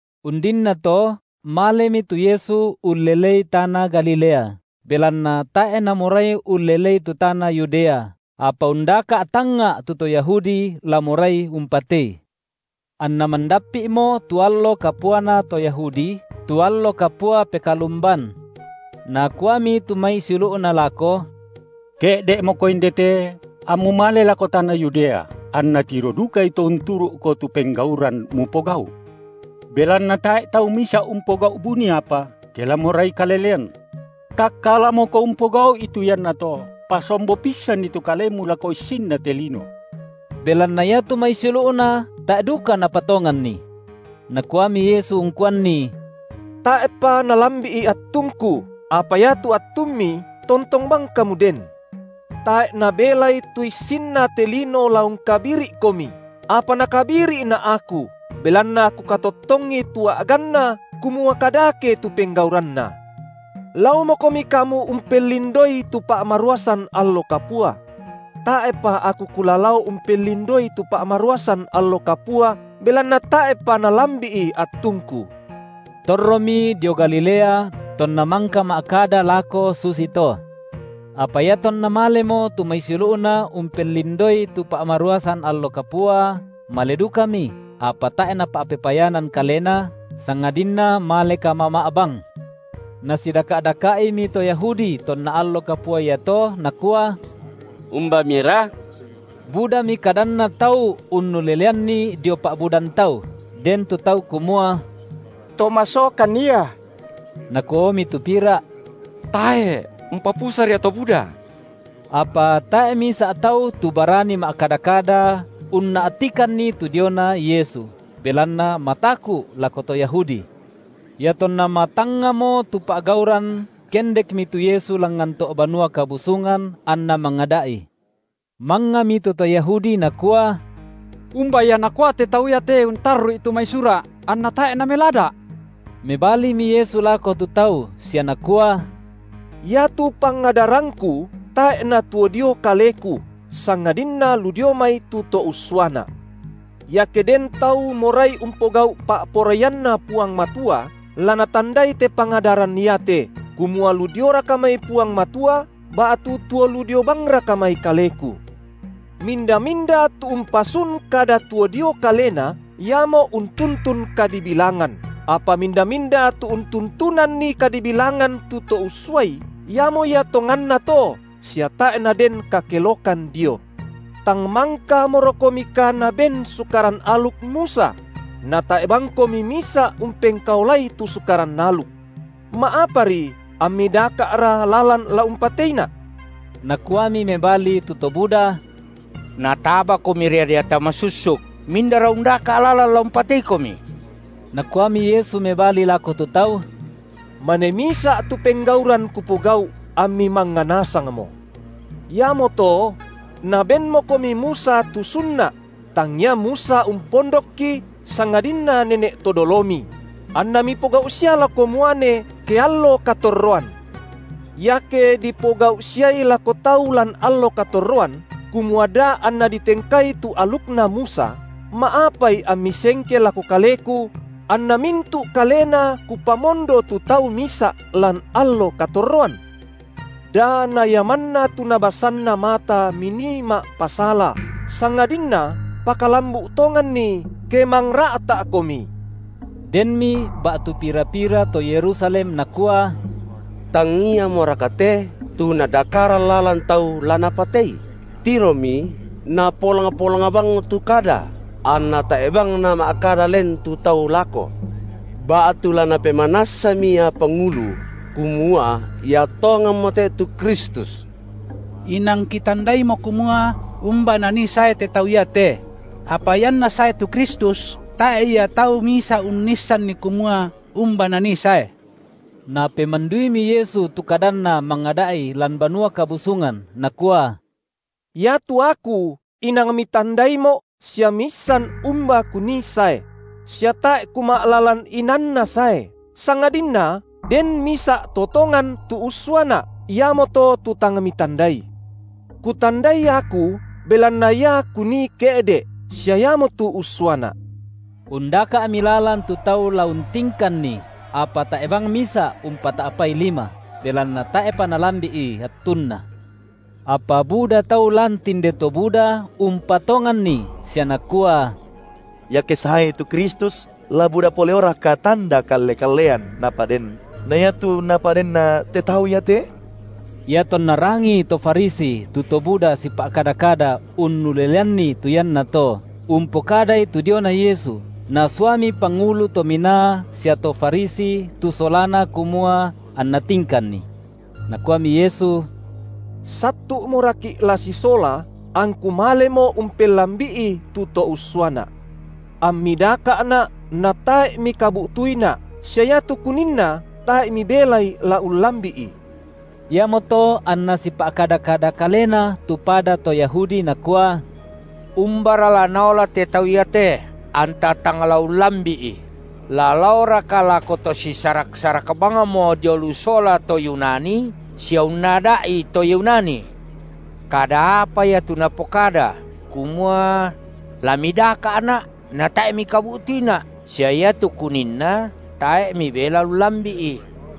Undinnato malemi tu Yesu ullelei tana Galilea, belanna tae’ namorai ullelei tu tana Yudea, apa undaka’ tangnga’ tu to Yahudi la morai umpatei. Anna mandappi’mo tu allo kapuana to Yahudi, tu allo kapua Pekalumban. Nakuami tu mai siulu’Na lako: Ke’de’moKo inde te, amMu male lako tana Yudea, anna tiro dukai to unturu’Ko tu penggauran Mupogau’. Belanna tae’ tau misa’ umpogau’ buni apa, ke la morai kalelean. TakkalamoKo umpogau’i tu iannato, pasombo pissanni tu Kalemu lako issinna te lino. Belanna iatu mai siulu’Na tae’ duka napatonganNi. Nakuami Yesu ungkuanni: Tae’pa nalambi’i attungKu, apa iatu attummi tontong bang kamu den. Tae’ nabelai tu issinna te lino la ungkabiri’komi, apa nakabiri’Na’ Aku, belanna Kukatottongi tu a’ganna, kumua kadake tu penggauranna. Laomokomi kamu umpellindoi tu pa’maruasan allo kapua. Tae’pa Aku Kula lao umpellindoi tu pa’maruasan allo kapua, belanna tae’pa nalambi’i attungKu. Torromi dio Galilea tonna mangka ma’kada lako susito. Apa iatonna malemo tu mai siulu’Na umpellindoi tu pa’maruasan allo kapua, male dukami, apa tae’ Napa’pepayanan Kalena, sangadinna male kamama’ bang. Nasidaka’-daka’Imi to Yahudi tonna allo kapua iato nakua: Umbamira? Budami kadanna tau unnuleleanNi dio pa’budan tau; den tu tau kumua: To masokan Ia, nakuaomi tu pira’: Tae’, umpapusa ria to buda. Apa tae’ misa’ tau tu barani ma’kada-kada unna’tikanni tu diona Yesu, belanna mataku’ lako to Yahudi. Iatonna matangngamo tu pa’gauran kendekmi tu Yesu langngan to’ Banua Kabusungan anNa mangada’i. Mangngami tu to Yahudi nakua: Umba Ia nakua te Tau te untarru’i tu mai Sura’ anna tae’ Namelada’? Mebalimi Yesu lako tu tau sia Nakua: Iatu pangadarangKu tae’ natuo dio Kaleku, sangadinna lu dio mai tu To ussuaNa’. Iake den tau morai umpogau’ pa’poraianNa Puang Matua, la natandai te pangadaran iate, kumua lu dioraka mai Puang Matua, ba’tu tuo lu dio bangraka mai Kaleku. Minda-minda tu umpasun kada tuo dio kalena, iamo untuntun kadibilangan, apa minda-minda tu untuntunanNi kadibilangan tu To ussuai, iamo ia tonganna to sia tae’ naden kakelokan Dio. Tang mangkamorokomika naben Sukaran aluk Musa? Natae’ bangkomi misa’ umpengkaolai tu Sukaran aluk. Ma’apari ammi daka’ra lalan la umpateiNa’? Nakuami mebali tu to buda: NatabaKomi ria deata masussuk. Mindara undaka’ lalan la umpateiKomi? Nakuami Yesu mebali lako tu tau: Mane misa’ tu penggauran Kupogau’, ammi mangnga nasangmo. Iamoto: nabenmokomi Musa tu sunna’ – tangia Musa umpondokki sangadinna nene’ to dolomi –; anna mipogau’ sia lako muane ke allo katorroan. Iake dipogau’ siai lako tau lan allo katorroan, kumua da anna ditengkai tu alukna Musa, ma’apai ammi sengke lako Kaleku, anna mintu’ kalena Kupamondo tu tau misa’ lan allo katorroan? Da na ia manna tu nabasanna mata minii ma’pasala, sangadinna pakalambu’ tonganni, ke mangra’ta’komi. Denmi ba’tu pira-pira to Yerusalem nakua: Tang Iamoraka te tu nadakaran lalan tau la napatei? Tiromi, Napolang-polang bangmo tu kada, anna tae’ bang nama’kada len tu tau lako. Ba’tu la napemanassami ia pangulu kumua Ia tonganmo te tu Kristus? Inang kitandaimo kumua umba Nanii sae te Tau iate; apa ianNa sae tu Kristus, tae’ ia tau misa’ unnisanni kumua umba Nanii sae. Napemanduimi Yesu tu kadanNa mangada’i lan Banua Kabusungan Nakua: Iatu Aku inang mitandaiMo’ sia miissan umba Kunii sae; sia tae’ Kuma’lalan inaanna sae, sangadinna den misa’ To tongan tu ussuaNa’, iamoto tu tang mitandai. Kutandai Aku, belanna Ia Kunii ke’de’, sia Iamotu ussuaNa’. Undaka’mi lalan tu tau la untingkanNi, apa tae’ bang misa’ umpata’pai lima, belanna tae’pa nalambi’i attunNa. Apa buda tau lan tinde to buda umpatonganNi sia nakua: Iake saeI tu Kristus, la buda pole’oraka tanda kalle-kallean Napaden na iatu Napadenna te Tau iate? Iatonna rangii to Farisi tu to buda sipa’kada-kada unnuleleanni tu iannato, umpokadai tu diona Yesu, nasuami pangulu to minaa sia to Farisi tu solana kumua anna tingkanNi. Nakuami Yesu: Sattu’moraki’ la sisola, angKu malemo umpellambi’i tu To ussuaNa’. Ammi daka’Na’, natae’ mikabu’tuiNa’, sia iatu Kuninna tae’ mibelai la ullambi’i. Iamoto anna sipa’kada-kada kalena tu pada to Yahudi nakua: Umbara la Naola te Tau iate anta tang la ullambi’i? La laoraka lako to sisarak-sarak bangmo dio lu sola to Yunani sia unnada’i to Yunani? Kada apa ia tu Napokada kumua: La midaka’Na’ natae’ mikabu’tuiNa’, sia iatu Kuninna tae’ mibelai ullambi’i?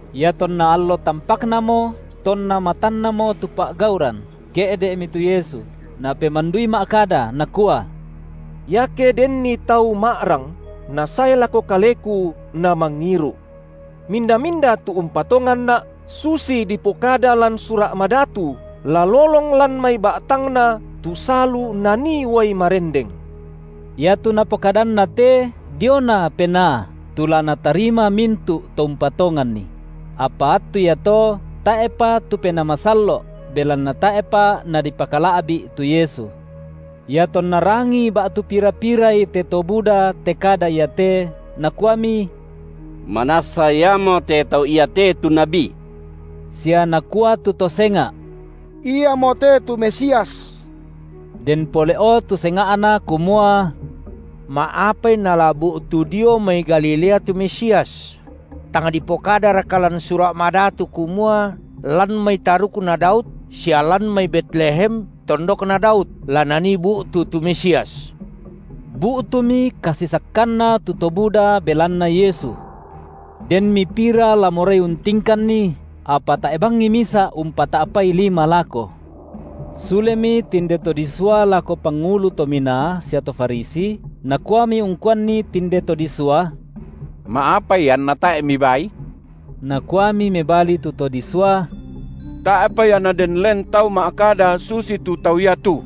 Iatonna allo tampaknamo, tonna matannamo tu pa’gauran, ke’de’mi tu Yesu, Napemandui ma’kada Nakua: Iake denni tau ma’rang, nasae lako Kaleku, namangiru’. Minda-minda tu umpatonganNa’ susi dipokada lan Sura’ Madatu, la lolong lan mai ba’tangna tu salu nanii uai marendeng. Iatu Napokadanna te diona Penaa, tu la natarima mintu’ to umpatonganNi; apa attu iato tae’pa tu Penaa Masallo’ belanna tae’pa Nadipakala’bi’ tu Yesu. Iatonna rangii ba’tu pira-pirai te to buda te kada iate, nakuami: Manassa Iamote Tau iate tu nabi. Sia nakua tu to senga’: Iamo te tu Mesias. Den pole’o tu senga’na kumua: Ma’apai nala bu’tu dio mai Galilea tu Mesias? Tang dipokadaraka lan Sura’ Madatu kumua lan mai tarukna Daud sia lan mai Betlehem, tondokna Daud, la Nanii bu’tu tu Mesias? Bu’tumi kasisakkanna tu to buda belanna Yesu. Denmi pira la morai untingkanNi, apa tae’ bangi misa’ umpata’pai lima lako. Sulemi tinde to disua lako pangulu to minaa sia to Farisi nakuami ungkuanni tinde to disua: Ma’apai anna tae’ mibaaI? Nakuami mebali tu to disua: Tae’pa ia naden len tau ma’kada susitu tau ia tu.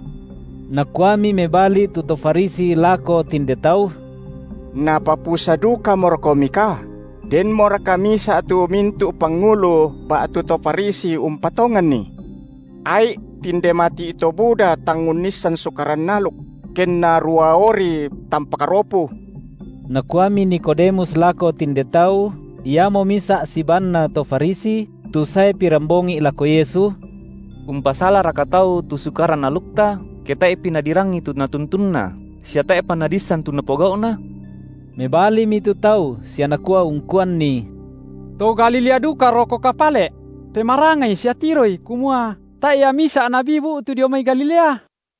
Nakuami mebali tu to Farisi lako tinde tau: Napapusa dukamorokomika? Denmoraka misa’ tu mintu’ pangulu ba’tu to Farisi umpatonganNi? Ai’, tinde mati’ to buda tang unnissan Sukaran aluk, kenna ruaori tampak ropu! Nakuami Nikodemus lako tinde tau, iamo misa’ sibaanna to Farisi, tu sae pirambongi’ lako Yesu: Umpasalaraka tau tu Sukaran alukta, ke tae’pi nadirangi tu natuntunna, sia tae’pa nadiissan tu napogau’na? Mebalimi tu tau sia nakua ungkuanni: To Galilea dukarokoka pale’? Pemarangai sia tiroi, kumua tae’ ia misa’ nabi bu’tu dio mai Galilea.